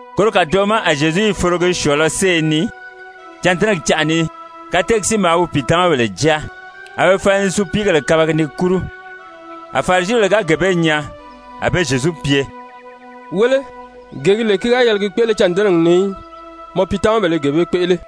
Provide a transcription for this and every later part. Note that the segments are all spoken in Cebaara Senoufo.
Koro kàdoʔo ma a Zyezu i forogi syɔ̀ɔ̄lɔ séye ni, cândɛnɛgɛ canʔa ni. Kateegi si maa wi pìitamabèle jáa, a be fala ni supiigèle kabagi ni kúru. A Farisibèle ga gee bee nyaa, a be Zyezu pye: «Wéle, gee gi lè ki ga yɛlɛ gi kpéʔele cândɛnɛgi ni í, mɔ piitamabèle i gee bee kpéʔele.»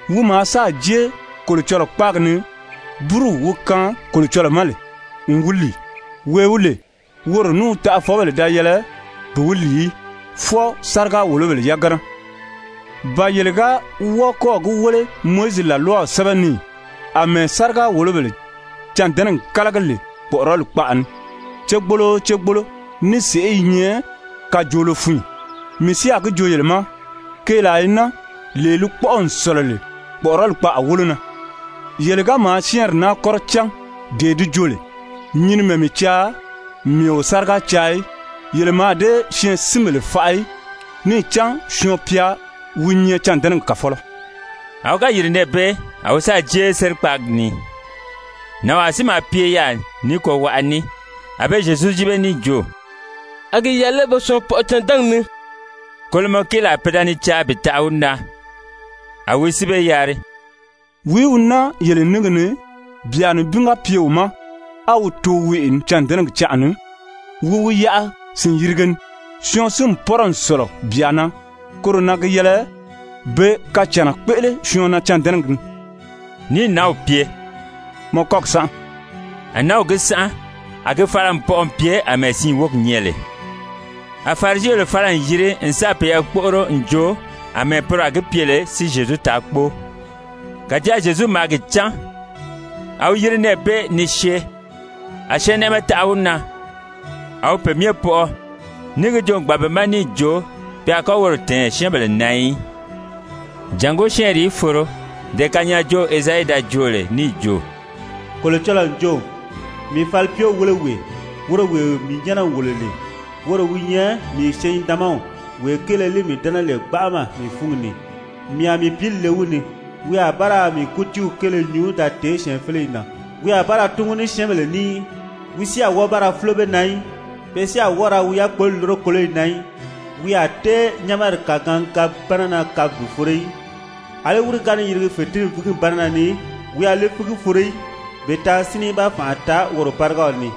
Wi maa sáà jée Kolocɔlɔɔ kpáagi ni búruw wi kaan Kolocɔlɔɔ ma n wi lìi, wee wi lè woro ní wi taʔafɔbèle da yɛlɛ bi wi lìi í, fwɔɔ sáriga-wòlobèle yagana. Ba yele ga wɔ́ɔ kɔ́ɔ̀ gi wéle Mowizi làlwaw sɛ́bɛ ni ì, àmɛɛ sáriga-wòlobèle cândɛnɛgi kálagi lè kpɔ̀ʔɔrɔli kpaʔa ni cégboolo o cégboolo ní sèʔé i nyɛ kajoolo fun ì? Mii si a gi joo yele ma: Keelaa i naa, lee li kpɔ́ʔɔ n sɔ̀lɔ lè kpɔ̀ʔɔrɔli kpaʔa wólo na. Yele ga maa syɛ́ɛnri naa kɔ́rɔ cán dee di jo lè: ‹Nyinimɛ mii caa, mii o sáriga caa í,› yele mǎà dée syɛɛnsinbèle faʔa í. Níì cán Syɔɔn-pya wi nyɛ cândɛnɛgi kàfɔlɔ.» A wi ga yìri nɛɛ bee a wi sáà jée be sérikpaagi ni. Nànwaa si maa pye yaà ní kɔwaʔa ní. A be Zyezu yíbe níì jo: «A gi yɛlɛ lé be syɔɔn pɔʔɔ cândɛnɛgi ni?» Kolomɔ kéelaa pe da ni caa bi taʔa wi na. A wi si be yari: «Wìí wi naa yele níngi ni, byà nibin ga pye wi ma á wi too weʔe ni cândɛnɛgi canʔa ni, wi wi yaʔa sìn-yirige ni? Syɔɔn si n pɔ́rɔ n sɔ̀lɔ byà na. Koro na gi yɛlɛ be kacànna kpéʔele syɔɔn na cândɛnɛgi ni.» Níì nǎnw pye: «Mɔ kɔ́gi sánʔa.» A nǎnw gi sánʔa, a gi fala n pɔʔɔ n pye àmɛɛ siin wógi nyɛ lè. A Farisibèle fala n yiri n sáà peyɛɛ kpóʔoro n joo àmɛɛ poro a gi pye lè si Zyezu taa kpóo. Kàjáa Zyezu maa gi cán, a wi yiri nɛɛ bee ni syée. A syɛɛnnɛʔɛmɛ taʔa wi na, a wi pe myɛ pɔʔɔ, níì gi joo n gbàn be ma níì jo pe a kɔ́ woro tɛ̀ɛn syɛ́ɛnbèle na í. Jàngó syɛ́ɛnri í foro dee kanyaajoow Ezayi da joo lè níì jo: «Kolocɔlɔɔ n jo: ‹Mii falipyew wéle wee, woro wee mii nyɛ́nɛ n wòlo lè. Woro wi nyɛ mii syɛɛn-nidaanmaw, wee kéele li mii dɛ́nɛ lè gbanʔama mii fúngi ni. Mii a mii pǐli le wi ni. Wi a ba ra kútiiw kéele nyuu da tèé Syɛɛnfeleyi na. Wi a ba ra túngu ní syɛ́ɛnbèle ní í, wi si a wɔ́ɔ ba ra fúlo be na í. Pe si a wɔ́ɔ ra wi yákpoli lúro kóloyi na í. Wi a tée nyɛ́nɛri kàgaangabi-bánana kabi bi foro í. Alí wírigi ga ni yirigi fètinfigi-bánana ni, wi a li fígi foro í bi taa sínni í ba fànʔa taa woro bárigaw ni.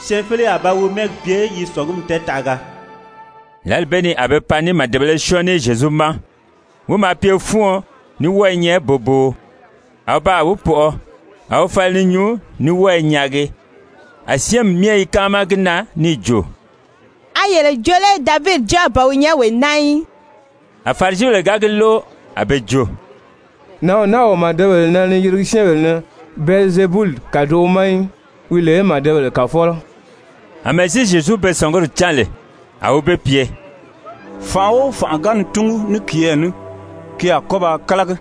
Syɛɛnfeleyi a ba wi mɛ́ɛgi pye yi sɔ̀ngumi tɛɛtaʔaga.›» Lǎli bee ni a be pan ní màdebēle syɔ́ɔn ní Zyezu ma, wi maa pye fúuɔn ní wɔ́ɔ i nyɛ boboo, a wi baa wi pɔʔɔ, a wi fala ni nyuu ní wɔ́ɔ i nyaagi. A syɛ́ɛnmi myɛ i káama gi na níì jo: «A yele jo lé Davidi Jáaw ban wi nyɛ wee naa í?» A Farisibèle ga gi lóʔo, a be jo: «Nǎnw naa o màdebèle nɛnɛ ni yirigi syɛ́ɛnbèle ni Bɛlizebuli kàdoʔo ma í, wi lè màdebèle kàfɔlɔ Amɛɛ si Zyezu be sɔ̀nguri cán lè, a wi be pye: «Fànʔa o fànʔa ga ni túngu ní kiyɛɛ ní, ki a kɔ́ ba kálagi.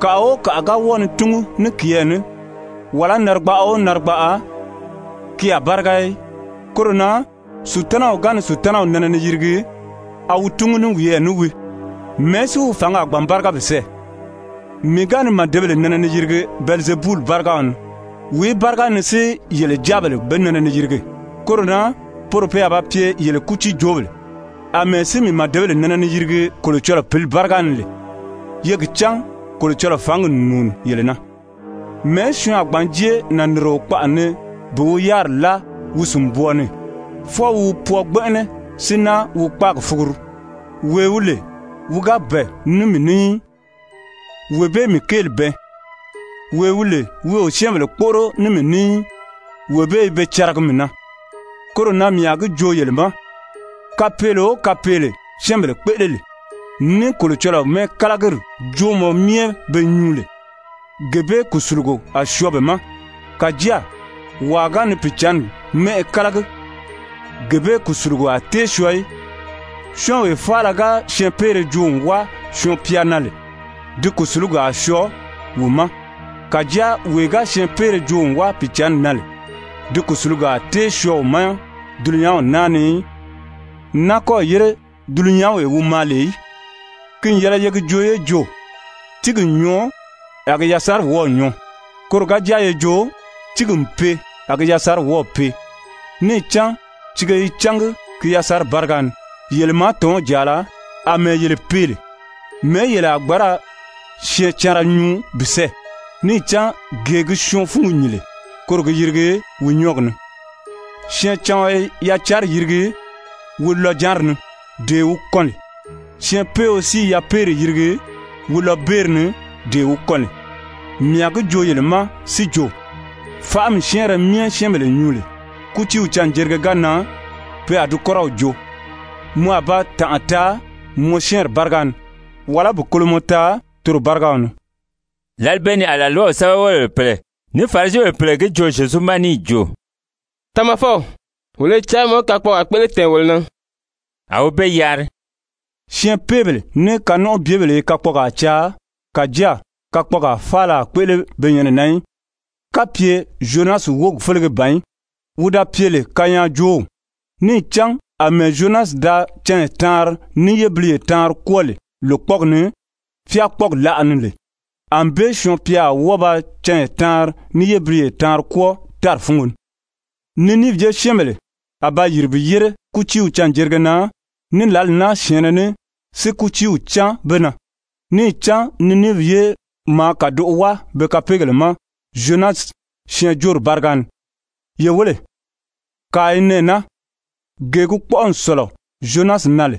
Kàʔa o kàʔa ga wɔ́ɔ ni túngu ní kiyɛɛ ní, wàlá narigbaʔa o narigbaʔa, ki a báriga í. Koro na Sutanaw ga ni Sutanaw nɛnɛ ni yirigi, a wi túngu ní wiyɛɛ ní wii, mɛ̀ɛ́ si wi fǎngi a gbǎn báriga bi sɛ́ɛ? Mii ga ni màdebèle nɛnɛ ni yirigi Bɛlizebuli bárigaw ni, wìí báriga ni si yele jáabèle be nɛnɛ ni yirigi? Koro na poro pe a ba pye yele kútiijoobèle. Amɛɛ si mii màdebèle nɛnɛ ni yirigi Kolocɔlɔɔ Pǐli báriga ni lè, ye gi cán Kolocɔlɔɔ fǎngi n nùuni yele na. Mɛ̀ɛ́ syɔɔn a gbǎn jée nànnirio kpaʔa ni bi wi yáriri láa wi sìnbwɔɔ ni? Fwɔɔ wi wi pwɔɔ gbɛnʔɛnɛ si náa wi kpáagi fuguru. Wee wi lè wi ga bɛ̀ɛ ní mii ní í, wee bee mii kéeli bɛɛn. Wee wi lè wi o syɛ́ɛnbèle kpóʔoro ní mii ní í, wee bee i be caragi mii na. Koro na mii a gi joo yele ma, kapeele o kapeele syɛ́ɛnbèle kpéʔele lè, ní Kolocɔlɔɔ mɛ́ɛkalagiri joomɔ myɛ be nyuu lè, gee bee kùsulugo a syɔɔ be ma. Kàjáa wàa ga ni Pìicǎnni mɛ́ʔɛ kálagi, gee bee kùsulugo a tée syɔɔ í. Syɔ́ɔnwee faala ga syɛɛnpeere joo n wáa Syɔɔn-pya na lè, di kùsulugi a syɔɔ wi ma. Kàjáa wee ga syɛɛnpeere joo n wáa Pìicǎnni na lè, di kùsulugi a tée syɔɔ wi ma dulunyanw naa ni í, n náa kɔ́ɔ̀ yére dulunyanwee wi maa lè í. «Ki n yɛlɛ ye gi joo ye jo: ‹Tíigi n nyɔɔ, a gi yasanri wɔ́ɔ̀ nyɔɔ.› Koro ga jáa ye jo: ‹Tíigi n pee a gi yasanri wɔ́ɔ̀ pee.› Níì cán tiige i cángi ki yasanri báriga ni. Yele màátɔnw jàala, àmɛɛ yele pee lè, mɛ̀ɛ́ yele a gbǎn ra syɛɛncanra nyuu bi sɛ́ɛ? Níì cán gee gi syɔɔn fúngi nyìn lè, koro gi yirigi wi nyɔ́ɔgi ni. Syɛɛncaɔn i yacanri yirigi wi lɔjanri ni, dee wi kɔn lè. Syɛɛnpeeo si i yapeeri yirigi wi lɔbeeri ni, dee wi kɔn lè. Mii a gi joo yele ma si jo, faʔami syɛ́ɛnrɛ myɛ syɛ́ɛnbèle nyuu lè, kútiiw canjerige ga nan, pe a di kɔ́rɔw joo. Mɔ a ba tànʔa taa mɔ syɛ́ɛnri báriga ni, wàlá bi kolomɔ taa toro bárigaw ni.» Lǎli bee ni a làlwaw sɛ́bɛwelebèle pèle ní Farisibèle pèle gi joo Zyezu ma níì jo: «Tamafɔw, wolo i caa mɔ í kakpɔɔgaa kpéʔele tɛ̀ɛn wolo na.» A wi be yari: «Syɛɛnpeebèle ní kanɔnʔɔbyebèle i kakpɔɔgaa caa, kàjáa kakpɔɔgaa faala a kpéʔele be nyɛnɛ na í, kapye Zyonasi wógi félege ban í, wi da pye lè kanyaajoow. Níì cán àmɛɛ ‹Zyonasi da canya taanri ní yébiliye taanri kwɔ́ɔ lè lòkpɔɔgi ni, fákpɔɔgi láʔa ni lè,› ànbée Syɔɔn-pya a wɔ́ɔ ba canya taanri ní yébiliye taanri kwɔ́ɔ tári fúngo ni. Niniivi ye syɛ́ɛnbèle a ba yìri bi yére kútiiw canjerige na ní lǎli naa syɛ̀ɛnnɛ ní si kútiiw cáan be na. Níì cán Niniivi ye maa kàdoʔo wáa be kapeegèle ma Zyonasi syɛɛnjóori báriga ni. Ye wéle, kàa i nɛɛ naa, gee gi kpɔ́ʔɔ n sɔ̀lɔ Zyonasi na lè.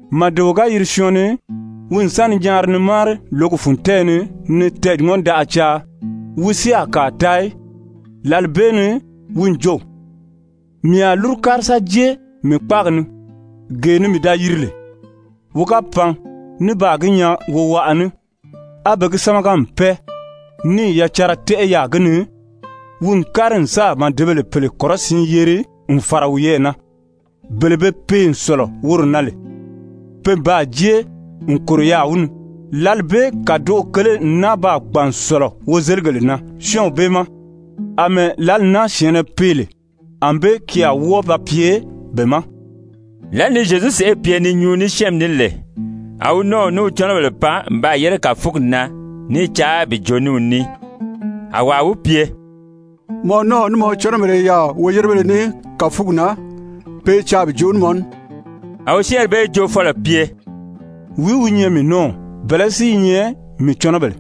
«Màdeo ga yiri syɔɔn ni, wi n sa ni nyaari ni máari lǒgi fun tɛ́ɛyɛ ni ni tɛɛ̀ŋɔndaʔa caa, wi si a kàa taa í. Lǎli bee ni wi n jo: ‹Mii a lúru kári sa jée mii kpáagi ni, gee ni mii da yiri lè.› Wi ga pan ní baa gi nyaa wowaʔa ní, á be gi sámaga n pɛ́ɛ níì yacanra tɛ́ʔɛ yaà gi ni, wi n kári n sáà màdebèle pèle kɔrɔsiin yeri n fàra wiyɛɛ na, bele be pee n sɔ̀lɔ woro na lè. Pe n baa jée n kòro yaà wi ni, lǎli bee kàdoʔo kele n náa baa gbàn n sɔ̀lɔ wozeligèle na syɔ́ɔnw bee ma. Amɛɛ lǎli naa syɛ̀ɛnnɛ pee lè, ànbée ki a wɔ́ɔ ba pye be ma.» Lǎli ni Zyezu sèʔé pye ni nyuu ní syɛ́ɛnmi ní lè, a wi nɔ́ɔw ní wi cɔnɔbèle pan n baa yére kàfugi na ní i caa bi joo ní wi ní. [A wàa wi pye: «Mɔ nɔ́ɔw ní mɔ cɔnɔbèle i yaà woyérebéle ní kàfugi na. Pe i caa bi joo ní mɔ ní.»] A wi syɛ́ɛnri bee joofɔlɔ pye: «Wìí wi nyɛ mii nɔ́ɔw? Bɛ̀lɛ́ si i nyɛ mii cɔnɔbèle?»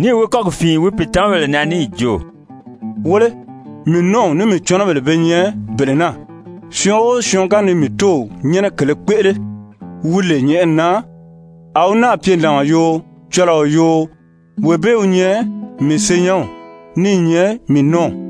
Níì wi kɔ́gi fìin wi pìitamabèle na níì jo: «Wéle, mii nɔ́ɔw ní mii cɔnɔbèle be nyɛ bele naa. Syɔɔn o syɔɔn ga ni mii Tóow nyɛ́nɛ kèlē kpéʔele, wi lè nyɛ̀ʔɛni na, a wi náà pye nàɔn yoo, cɔlɔɔ yoo, wee bee wi nyɛ mii senyɛnw ní i nyɛ mii nɔ́ɔw.»